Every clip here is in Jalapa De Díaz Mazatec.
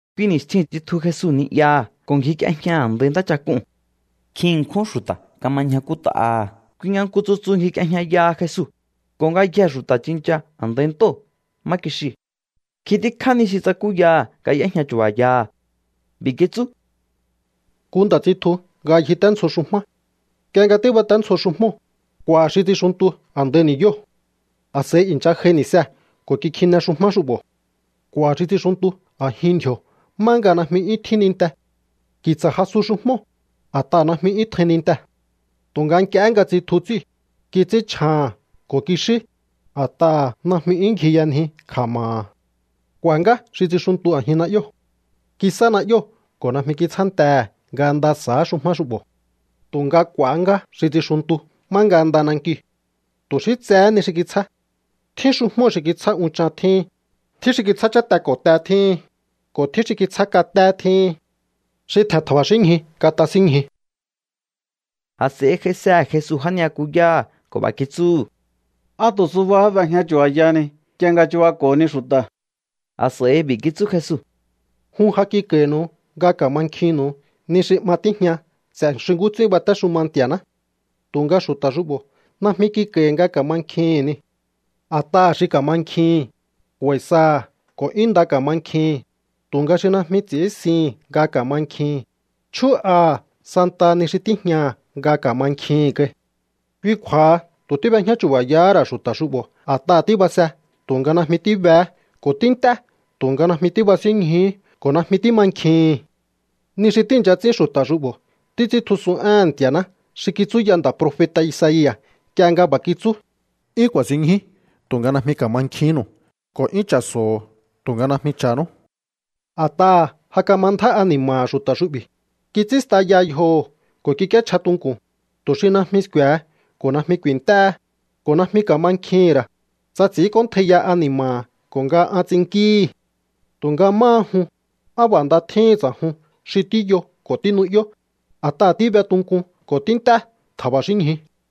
Kui ni̱stjiu̱n tsitju Jesu ni'yaha̱ ko̱ ngjik'iejña a̱ndai ntáchak'uu̱n. Nkjin ṉkjún xu̱ta̱ kama ñjakút'aha̱. Kui nga nku tsutsu ngjik'iejñayaha Jesu, ko̱ ngayjee̱ xu̱ta̱ tsincha a̱ndai ntóo̱ má kixiu̱. Nkjin tíkjá ni xi tsakúyaha̱ nga y'éjña chu̱ba̱yaha̱. B'i̱ kitsú: —Nku nda̱ tsitju nga ngjiténdzjo xujmá. Nk'ie nga tíbaténdzjo xujmóo̱, k'u̱a̱ xi tsixuntu a̱ndai ni̱yóo̱. A̱s'a̱i i̱ncha j'ai ni̱see̱ ko̱ kikjine xujmá xu'bo̱. K'u̱a̱ xi tsixuntu a̱jin ndji̱o̱ má nga najmi 'yún tjín ninte. Ki̱tsa̱ jasu xujmóo̱, a̱t'aha̱ najmi 'yún tjain nintee̱. Tu̱nga nk'iehé nga tsitju ts'íu̱, kits'ínchjaha̱n ko̱ kixí, a̱t'aha̱ najmi 'yún ngjiyanji kja̱ma̱ha̱. K'u̱a̱ ngá xi tsixuntu a̱jin na'yóo̱. Kisá na'yóo̱ ko̱ najmi kitsjántehe̱ nga nda sa̱á xujmá xu'bo̱. Tu̱nga k'u̱a̱há ngá xi tsixuntu má nga nda nankiu̱. Tu̱ xí tsehé ni xi kitsjá. Tjín xujmóo̱ xi kitsjá unchan tjíhin, tjín xi kitsjá cháte ko̱ te tjíhin, ko̱ tjín xi kitsjá katé tjíhin. Xi tje̱n tja̱ba̱xínñju, katasínñju. A̱s'a̱i j'aisehe̱ Jesu já ni'yakuyáha̱ ko̱ b'a̱ kitsúhu̱: —¿Á tu̱ subahá b'ejña chu̱ba̱yahani nk'ie nga chubako̱honi xu̱ta̱? A̱s'a̱i b'i̱ kitsú Jesu: —Jun ja kik'a̱i̱nu̱u nga ka̱mankjinnu̱u ni xi 'ma tíjña ts'e̱ xi nkú ts'ín batéxuma Nti̱a̱ná. Tu̱nga xu̱ta̱ xu'bo̱ najmi kik'a̱i̱hi̱ nga ka̱mankjihi̱n niu̱. A̱t'aha̱ xi kamankjihi̱n, k'u̱a̱i̱ saha̱ ko̱ 'yún nda ka̱mankjihi̱n. Tu̱nga xi najmi ts'i̱ínsihi̱n nga ka̱mankjihi̱n, chjú'aha̱ santaha ni xi tíjñaha̱ nga ka̱mankjihi̱n kai. Kui kju̱a̱ha tu̱ tíb'ejñá chu̱ba̱yahá ra̱ xu̱ta̱ xu'bo̱. A̱t'aha̱ tíbase tu̱nga najmi tíbehé, ko̱ tínt'é tu̱nga najmi tíbasínñjuhú ko̱ najmi tímankjihi̱n. ’Ni xi tíi̱ncha ts'ín xu̱ta̱ xu'bo̱ títs'íntjusun éhe̱n Nti̱a̱ná xi kitsúya nda̱ profeta̱ Isaia̱ nk'ie nga b'a̱ kitsú: 'Yún ku̱a̱sinñju tu̱nga najmi ka̱mankjihínnu̱u, ko̱ 'yún cha̱so̱o tu̱nga najmi cha̱nú. A̱t'aha̱ ja kama ndjá ani̱ma̱ha̱ xu̱ta̱ xu'bi̱, kits'ín staya yjoho̱ ko̱ kik'íéchja tunku̱n, tu̱ xi najmi sku̱e̱he ko̱ najmi ku̱i̱nt'éhe, ko̱ najmi ka̱mankjihi̱n ra̱, tsa ts'i̱ínk'óntjaiya ani̱ma̱ha̱ ko̱ nga an ts'innkíhi̱. ’Tu̱nga máha jun, á b'a̱ nda tjíhin ts'a̱jun xi tíyo ko̱ tínu'yó, a̱t'aha̱ tíbe tunkun ko̱ tínt'é tja̱ba̱xínñju.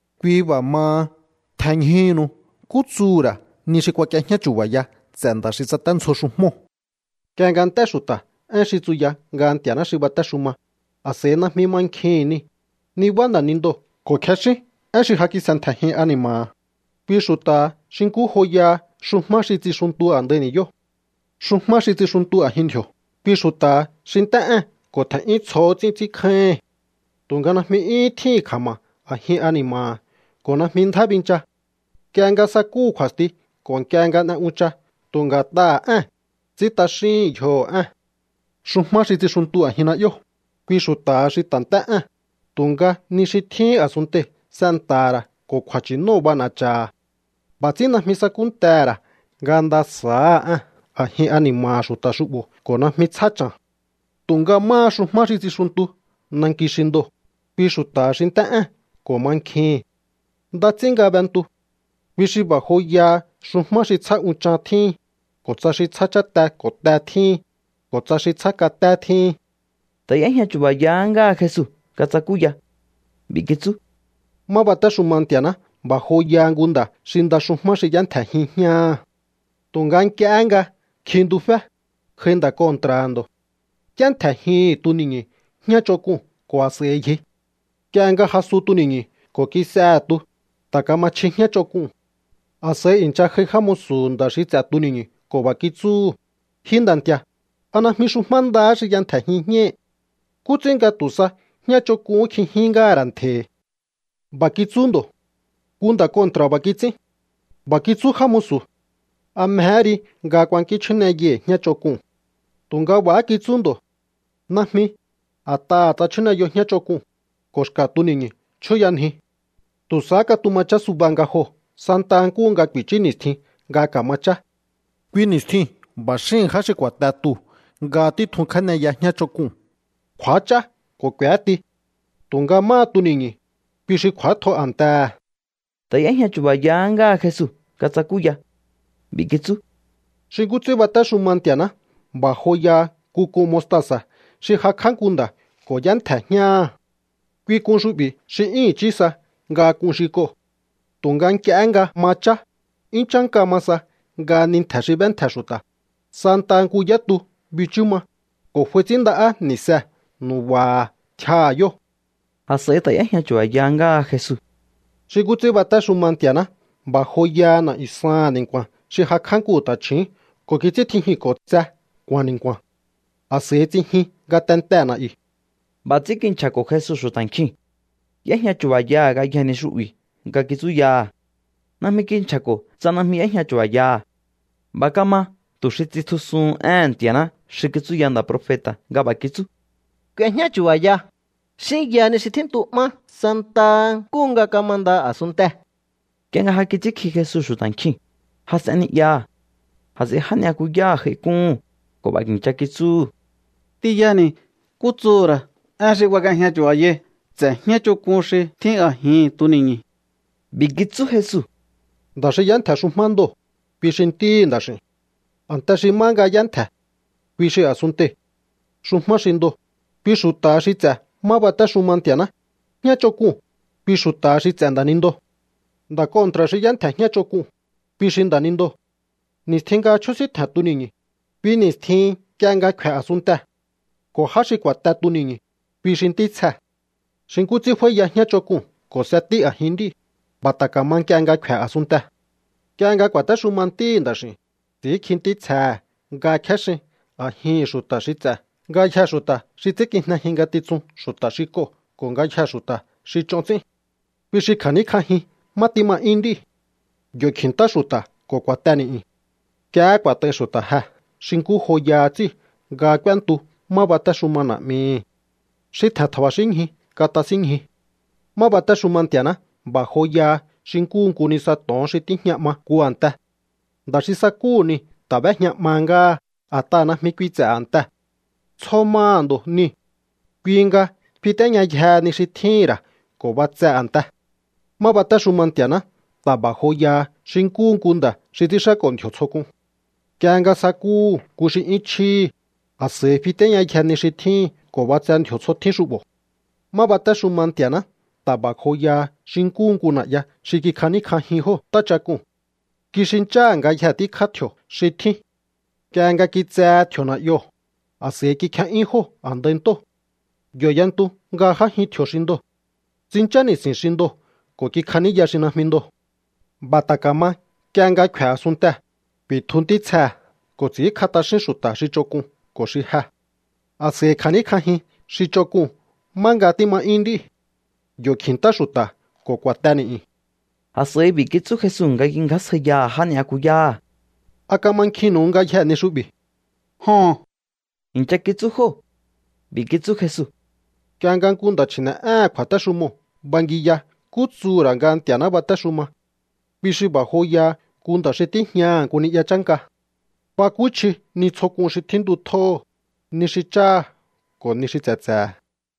’Kui b'a̱ maha, tjenñjuhúnu nkú tsuhu̱ ra̱ ni xi kuak'iejñá chu̱ba̱ya ts'e̱ nda̱ xi tsaténdzjo xujmóo̱. Nk'ie nga nt'é xu̱ta̱ én xi tsuya nga Nti̱a̱ná xi batéxuma, a̱s'a̱i najmi mankjihi̱n niu̱, nibá nda̱nindoo̱ ko̱ kjexín én xi ja kis'entje̱jin ani̱ma̱ha̱. Kui xu̱ta̱ha xi nkú joya xujmá xi tsixuntu a̱ndai ni̱yóo̱. ’Xujmá xi tsixuntu a̱jin ndji̱o̱, kui xu̱ta̱ha xi nt'é ée̱n ko̱ tje̱n'yún tsjohó ts'ín ts'ínkjáíhi̱n. Tu̱nga najmi 'yúhún tjíhi̱n kja̱ma̱ a̱jin ani̱ma̱ha̱ ko̱ najmi ndjá bincha. Nk'ie nga sakúhu̱ kju̱a̱sti ko̱ nk'ie nga n'e uncha tu̱ nga̱t'aha̱ ée̱n, ts'ín t'axíhi̱n yjoho̱ ée̱n. ’Xujmá xi tsixuntu a̱jin na'yóo̱, kui xu̱ta̱ha xi ta̱ nt'é ée̱n, tu̱nga ni xi tjíhín a̱sunntei̱ s'enta̱ha̱ ra̱ ko̱ kju̱a̱nchi̱nóo̱ b'ana̱cha̱ha̱. B'a̱ ts'ín najmi sakúntehe̱ ra̱ nga nda sa̱áha ée̱n a̱jin ani̱ma̱ha̱ xu̱ta̱ xu'bo̱ ko̱ najmi tsjá cha̱n. ’Tu̱nga máha xujmá xi tsixuntu nanki xi ndoo̱, kui xu̱ta̱ha xi nt'é ée̱n ko̱ mankjihi̱n. Nda ts'ín nga b'entu. Kui xi b'a̱ joyaha xujmá xi tsjá unchan tjíhin, ko̱ tsa xi tsjá cháte ko̱ te tjíhin, ko̱ tsa xi tsjá katé tjíhin. Ta̱ y'éjña chu̱ba̱yahá ngáha Jesu nga tsakúya. B'i̱ kitsú: —Má batéxuma Nti̱a̱ná b'a̱ joyaha nku nda̱ xi nda xujmá xi y'éntje̱jin jñáha̱. Tu̱nga nk'iehé nga kjintufé, j'ai nda̱ kontra̱ha̱ ndo̱. Y'éntje̱jihi̱n tuni̱ñu̱ jñá ch'onk'un ko̱ a̱s'a̱i ngji. Nk'ie nga jasu tuni̱ñu̱ ko̱ kis'ehe̱ tu, ta̱ kama chji jñá ch'onk'uu̱n. A̱s'a̱i i̱ncha j'ai já musu̱hu̱ nda̱ xi ts'e̱ tuni̱ñu̱ ko̱ b'a̱ kitsúhu̱: “Ji nda̱ nti̱a̱, ¿a najmi xujmá ndahá xi y'entje̱jin jñáhi̱? ¿Nkú ts'ín nga tu̱ sa jñá ch'onk'uhún kj'ijin ngáha̱ ra̱ ntje̱hi̱?” B'a̱ kitsú ndo̱: “Nku nda̱ kontra̱ b'a̱ kits'ín.” B'a̱ kitsú já musu̱: “¿A mjehé ri nga kuankín chjúneyai̱ jñá ch'onk'uu̱n?” Tu̱nga b'a̱há kitsú ndo̱: “Najmi, a̱t'aha̱ tsa chjúneyo jñá ch'onk'uu̱n, ko̱ xka̱ tuni̱ñu̱ chjúyanjiu. Tu̱ sahá katuma chá suba nga joo̱ santaha nkúhu nga ku̱i̱chú ni̱stjin nga ka̱ma chá. Kui ni̱stjiu̱n b'a̱ xíhi̱n já xi ku̱a̱te tuu̱ nga títjun kjéneya jñá ch'onk'uu̱n, kj'u̱ách'á ko̱ k'u̱éti. Tu̱nga máha tuni̱ñu̱, kui xi kj'u̱átjo a̱ntehe̱.” Ta̱ y'éjña chu̱ba̱yahá ngáha Jesu nga tsakúya. B'i̱ kitsú: —Xi nkú ts'ín batéxuma Nti̱a̱ná b'a̱ joyaha nku k'un mostasa̱ xi jakj'á nku nda̱ ko̱ y'éntje̱ jñáha̱. Kui k'un xu'bi̱ xi 'yún i̱chí sa nga k'un xi k'oo̱. Tu̱nga nk'iehé nga ma chá, 'yún chánka ma sa nga ni ntje̱ xi b'éntje̱ xu̱ta̱. Santaha nku yá tu bichú ma, ko̱ f'ai ts'ínnda'á ni̱see̱ nu̱ba̱ha̱ tjiaha̱ yóo̱. A̱s'a̱i ta̱ y'éjña chu̱ba̱ya ngáha Jesu: —Xi nkú ts'ín batéxuma Nti̱a̱ná b'a̱ joyaha na̱'yu̱ saha̱n ni̱nku̱a̱n xi jakj'á nku ta̱chju̱ún ko̱ kits'íntjijinko̱ tse nku̱a̱n ni̱nku̱a̱n. A̱s'a̱i tsijin ngatente na̱'yu̱. B'a̱ ts'ín kinchja̱ko̱ Jesu xu̱ta̱ nkjiu̱n. Y'éjña chu̱ba̱yaha̱ ngayjee̱ ni xu'bi̱ nga kitsúyaha̱. Najmi kinchja̱ko̱ tsa najmi y'éjña chu̱ba̱yaha̱. B'a̱ kama tu̱ xi tsitjusuhun éhe̱n Nti̱a̱ná xi kitsúya nda̱ profeta̱ nga b'a̱ kitsú: K'uejñá chu̱ba̱ya, xínya ni xi tjíntu'má santaha nkúhu nga kamanda a̱sunntee̱. Nk'ie nga ja kits'ínkji Jesu xu̱ta̱ nkjiu̱n, jas'en ni'yaha̱. A̱s'a̱i já ni'yakuyáha̱ j'aik'úhu̱n ko̱ b'a̱ i̱ncha kitsúhu̱: —T'inyani̱ nkú tsuhu̱ ra̱ én xi kuak'iejña chu̱ba̱yai ts'e̱ jñá ch'onk'un xi tjín a̱jihi̱n tuni̱ñu̱. B'i̱ kitsú Jesu: —Nda̱ xi y'éntje̱ xujmá ndoo̱, kui xi Ntíhi̱ Nda̱x'i̱u̱n. A̱nte xi má nga y'éntje̱, kui xi a̱sunntei̱. Xujmá xi ndoo̱, kui xu̱ta̱ha xi ts'e̱ má batéxuma Nti̱a̱ná. Jñá ch'onk'uu̱n, kui xu̱ta̱ha xi ts'e̱ nda̱nindoo̱. Nda̱ kontra̱ xi y'éntje̱ jñá ch'onk'uu̱n, kui xi nda̱nindoo̱. Ni̱stjin nga chjúsíntje̱n tuni̱ñu, kui ni̱stjihin nk'ie nga kfe̱ a̱sunntee̱. Ko̱ já xi ku̱a̱te tuni̱ñu̱, kui xi ntítsjee̱. ’Xi nkú ts'ín f'áíya jñá ch'onk'uu̱n ko̱ s'etí a̱jin nd'íu̱, b'a̱ ta̱ ka̱ma nk'ie nga kfe̱ a̱sunntee̱. Nk'ie nga ku̱a̱téxuma Ntíhi̱ Nda̱x'i̱u̱n, ts'i̱ínkji ntítsjehe̱ nga kjéxin a̱jihi̱n xu̱ta̱ xi ts'e̱ ngayjee̱ xu̱ta̱ xi ts'ínkijnejin ngatitsun xu̱ta̱ xi k'oo̱ ko̱ ngayjee̱ xu̱ta̱ xi ch'on ts'ín. Kui xi kja̱níkj'ajin má tíma 'yún nd'íu̱. Yo̱ kji̱ntá xu̱ta̱ ko̱ ku̱a̱te ni̱'yu̱n. Nk'iehé ku̱a̱t'ai xu̱ta̱ jee̱ xi nkú joyaha ts'íu̱ nga k'úéntu má batéxuma Na̱'mihi̱. Xi tje̱n tja̱ba̱xínñju, katasínñju. ’Má batéxuma Nti̱a̱ná b'a̱ joyaha xi nkúhu nku nisa to̱on xi tíjña 'ma nku a̱nte. Nda̱ xi sakúhu̱ niu̱ ta̱ b'éjña 'mahá ngáha a̱t'aha̱ najmi kui ts'e̱ a̱ntee̱. Tsjo maha̱ ndo̱ niu̱. Kui nga fitéñayjehe ni xi tjíhi̱n ra̱ ko̱ b'atse a̱ntee̱. ’Má batéxuma Nti̱a̱ná ta̱ b'a̱ joyaha xi nkúhu nku nda̱ xi ts'ínxáko̱ ndji̱o̱ tsjo k'un. Nk'ie nga sakúhu̱ nku xi 'yún chjíhi̱, a̱s'a̱i fitéñayje ni xi tjíhi̱n ko̱ b'atse ndji̱o̱ tsjo tjín xu'bo̱. ’Má batéxuma Nti̱a̱ná ta̱ b'a̱ joyaha xi nkúhu nku na̱'ya xi kikjaníkj'ajin jóo̱ ntáchak'uu̱n. Kixincháha̱ ngayjee̱ tíkjá tji̱o̱ xi tjín. Nk'ie nga kitsehe tji̱o̱ na̱'yoo̱, a̱s'a̱i kikje'yún jóo̱ a̱ndai ntóo̱. Yo̱ y'entu nga j'ájin tji̱o̱ xi ndoo̱. Tsinchá ni̱si̱n xi ndoo̱ ko̱ kikjaníya xi najmi ndoo̱. B'a̱ ta̱ ka̱ma nk'ie nga kfe̱ a̱sunntee̱. Ku̱i̱tju ntítsjee̱ ko̱ ts'i̱ínkj'a t'axín xu̱ta̱ xi ch'onk'un ko̱ xi je. A̱s'a̱i kja̱níkj'ajin xi ch'onk'uu̱n má nga tíma 'yún nd'íu̱. Yo̱ kji̱ntá xu̱ta̱ ko̱ ku̱a̱te ni̱'yu̱n. A̱s'a̱i b'i̱ kitsú Jesu nga kingjásjaiyaha̱ já ni'yakuyáha̱: —¿A kamankjinnu̱u ngayjee̱ ni xu'bi̱? —Joho̱n —i̱ncha kitsú jóo̱. B'i̱ kitsú Jesu: —Nk'ie nga nku nda̱ chji̱ne̱'éhe̱n kju̱a̱téxumoo̱ bangiya nkú tsuhu̱ ra̱ nga Nti̱a̱ná batéxuma, kui xi b'a̱ joyaha nku nda̱ xi tíjñaha̱ nku ni'ya chánka. Bakúchji ni tsjo k'un xi tjíntutjóho̱, ni xi cháha̱ ko̱ ni xi tse̱tse̱he̱.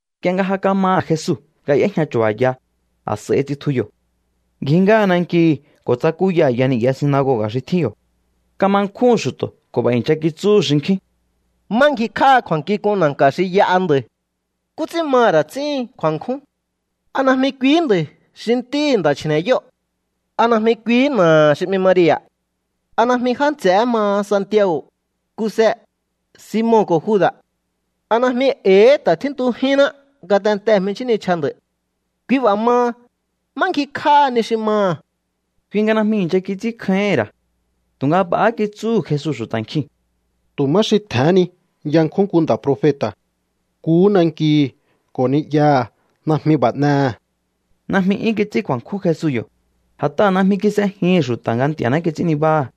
Nk'ie nga ja kamaha̱ Jesu nga y'éjña chu̱ba̱ya, a̱s'a̱i tsitju yo̱. Ngji ngáha nankihi̱ ko̱ tsakúya a̱ya ni'ya sinagoga̱ xi tjín yo̱. Kama nkjúhu̱n xu̱to̱ ko̱ b'a̱ i̱ncha kitsúhu̱ xinkjín: —¿Má ngjikj'áha kju̱a̱nkjink'un na̱nka̱ xi y'aha nda̱i̱? ¿Nkú ts'ín maha̱ ra̱ ts'íhin kju̱a̱nkjún? ¿A najmi kuihí nda̱i̱ xi ntíhi̱ nda̱ chji̱ne̱yóo̱? ¿A najmi kuihí na̱aha̱ xi 'mi Maria̱? ¿A najmi já nts'e̱hé maha Santiago̱, Kuse, Simon ko̱ Juda̱? ¿A najmi e̱i̱hí ta̱ tjíntujínná ngatentee̱ jminchjín nichja nda̱i̱? Kui b'a̱ maha, ¿má ngjikj'áha ni xi maha̱? Kui nga najmi i̱ncha kits'ínkjáíhi̱n ra̱. Tu̱nga b'a̱há kitsúhu̱ Jesu xu̱ta̱ nkiu̱n: —Tu̱ má xi tje̱hén ni yankjún nku nda̱ profeta̱. Nkuhú nankihi̱ ko̱ ni'yaha̱ najmi b'a̱ n'ehe̱. Najmi 'yún kits'ín kju̱a̱nkjún Jesu yo̱, a̱t'aha̱ najmi kis'ejihi̱n xu̱ta̱ nga Nti̱a̱ná kits'ín nibáha̱.